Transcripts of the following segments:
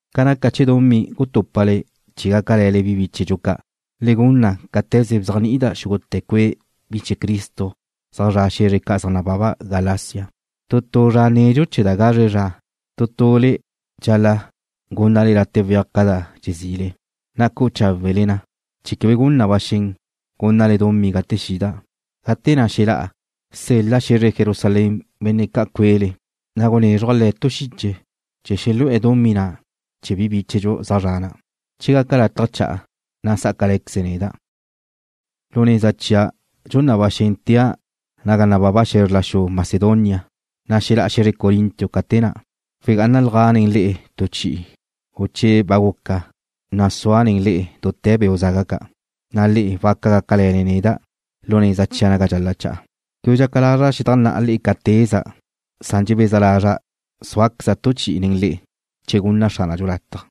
Ca naca chee̱ dumí gutúpale chee̱ gácale̱le bi bíchedxu ca', le gun na cáte̱ze bzéajni'ida' xúgute̱ cue' bi chee̱ Cristo zaj zra' xe̱zre ca' zaj nababa Galacia. Tu tu zra nedxu chee̱ da gazre zra tu tule le'e dxal-la' gúnnale late' weaj ca da dxezile, na' cu'u cháwele na chee̱ quebe gun na ba xen gúnnale dumí gate xida'. Gate na' xelá'a, sel-la' xe̱zre Jerusalén benne' ca' cuele, na' gunézruja' le̱' tu xiche chee̱ xelu'e̱ dumí na' chee̱ bi bíchedxu zaj zre̱'e̱ na'. Che gata' lataj cha'a, na' sá'acale̱queze̱' neda'. Lu neza chia' dxun na ba xen tea' naga nababa xe̱zr la xu Macedonia, na' xelá'a xe̱zre Corinto ca te na'. Wegá'analja' nen le'e tu chi'i, u che ba guca, na' sua' nen le'e dute̱ beu' zaga ca', na' le'e waca gácale̱le neda' lu neza chia' naga dxal-la' cha'a. Quebe dxaca lazra' xedajnná'a le'e ca teza', san dxebeza lazra' súaqueza' tu chi'i nen le'e, che gunna Xránadxu lataj.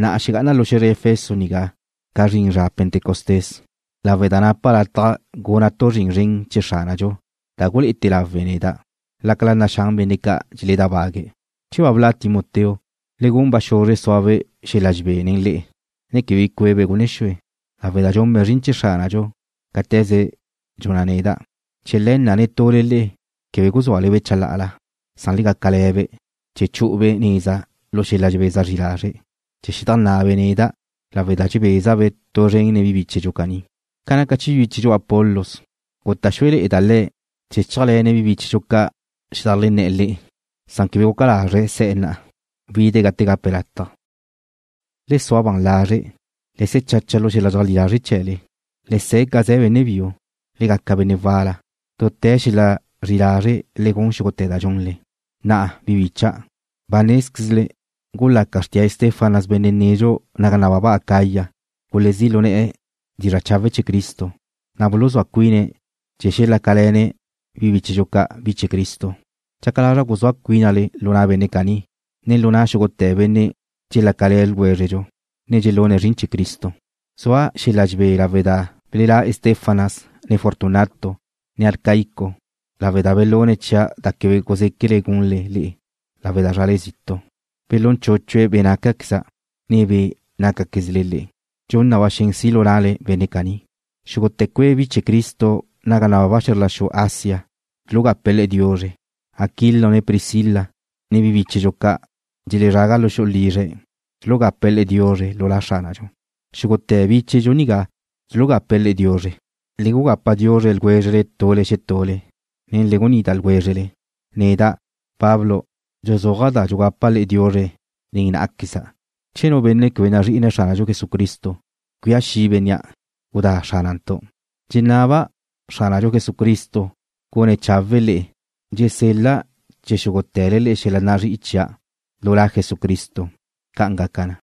Na'a xegá'ana' lu xe̱zre Efeso nigá ca zrin zra Pentecostés, lawe' da napa' lataj guna' tu zrin zren chee̱ Xránadxu da gulé'ete̱ lawe na, lácala naxán benne' ca' dxeledábague̱'. Che ba bla' Timoteo, le gun ba xuzre suabe' xel-la dxebé nen le'e, ne quebe bi cué'ebe' gunne xue, lawe' da dxunbe' zrin chee̱ Xránadxu cáte̱ze dxun neda'. Chee̱ le̱ na' netule le'e quebe guzúale-be' chalá'ala, san le gácale̱-be' chee̱ xexu'ube' neza lu xel-la dxebeza zri lazre' chee̱ xedajnná'abe' neda', lawe' da dxebeza'-be' tu zren nen bi bíchedxu caní. Ca naca chee̱ bíchedxu Apolos, guta' xúele̱'e̱da' le̱' chee̱ chéajle̱ne̱' bi bíchedxu ca' xedajlenné̱'e̱ le'e, san quebe guca lazre̱' se̱'e̱ na'a. Wide̱' gate gape̱' lataj. Le sua ban lazre'. Le se̱ chacha lu xel-la dxeajlí lazre' chee̱le. Le se̱ ca ze̱ benne' biu. Le gaca benne' wal-la. Dute̱ xel-la zri'i lazre' le gun xúgute̱ da dxunle. Na'a, bi bícha'dau', ba nézquezle gulaca xrtía Estéfanas benne' nedxu naga nababa Acaya gulezí' lu ne̱'e̱ dizra' chawe' chee̱ Cristo, na' buluzúa cuine̱' chee̱ xelácale̱ne̱' bi bíchedxu ca', bi chee̱ Cristo. Dxaca lazra' guzúa cuínale lu na' benne' caní, ne lu na' xúgute̱ benne' dxelácale̱ ljwézredxu, ne dxelún zrin chee̱ Cristo. Zua' xel-la dxebé lawe' da belelá' Estéfanas, ne Fortunato, ne Acaico, lawe' da belune̱' chia' da quebe guzéquele gunle le'e lawe' da zrale zitu'. Belún chúchue̱' be' nácaqueza', ne be' nácaquezle le'e. Dxun na ba xen si' lu na'le benne' caní. Xúgute̱ cue' bi chee̱ Cristo naga nababa xe̱zr la xu Asia dxulugapa le'e diuzre. Aquilo ne Priscila, ne bi bíchedxu ca' dxelezraga lu xu'u lizre̱' dxulugápale̱'e̱ le'e diuzre lu La Xránadxu. Xúgute̱ bíchedxu nigá dxulugape̱' le'e diuzre. Le gugapa diuzre ljwézrele tule xetule, ne le gunida ljwézrele. Neda', Pablo, dxuzúaja' da dxugapa' le'e diuzre nen ná'aqueza'. Che nu benne' quebe nazrí'ine̱' Xránadxu Jesucristo, cuía xi' bénnea'. ¡Gudá Xránantu'! Dxenaba' Xránadxu Jesucristo gun cháwe'e̱ le'e. Dxusel-la' chee̱ xúgute̱le xel-la nazrí'i chia' lu La Jesucristo. ¡Ca'an gaca na!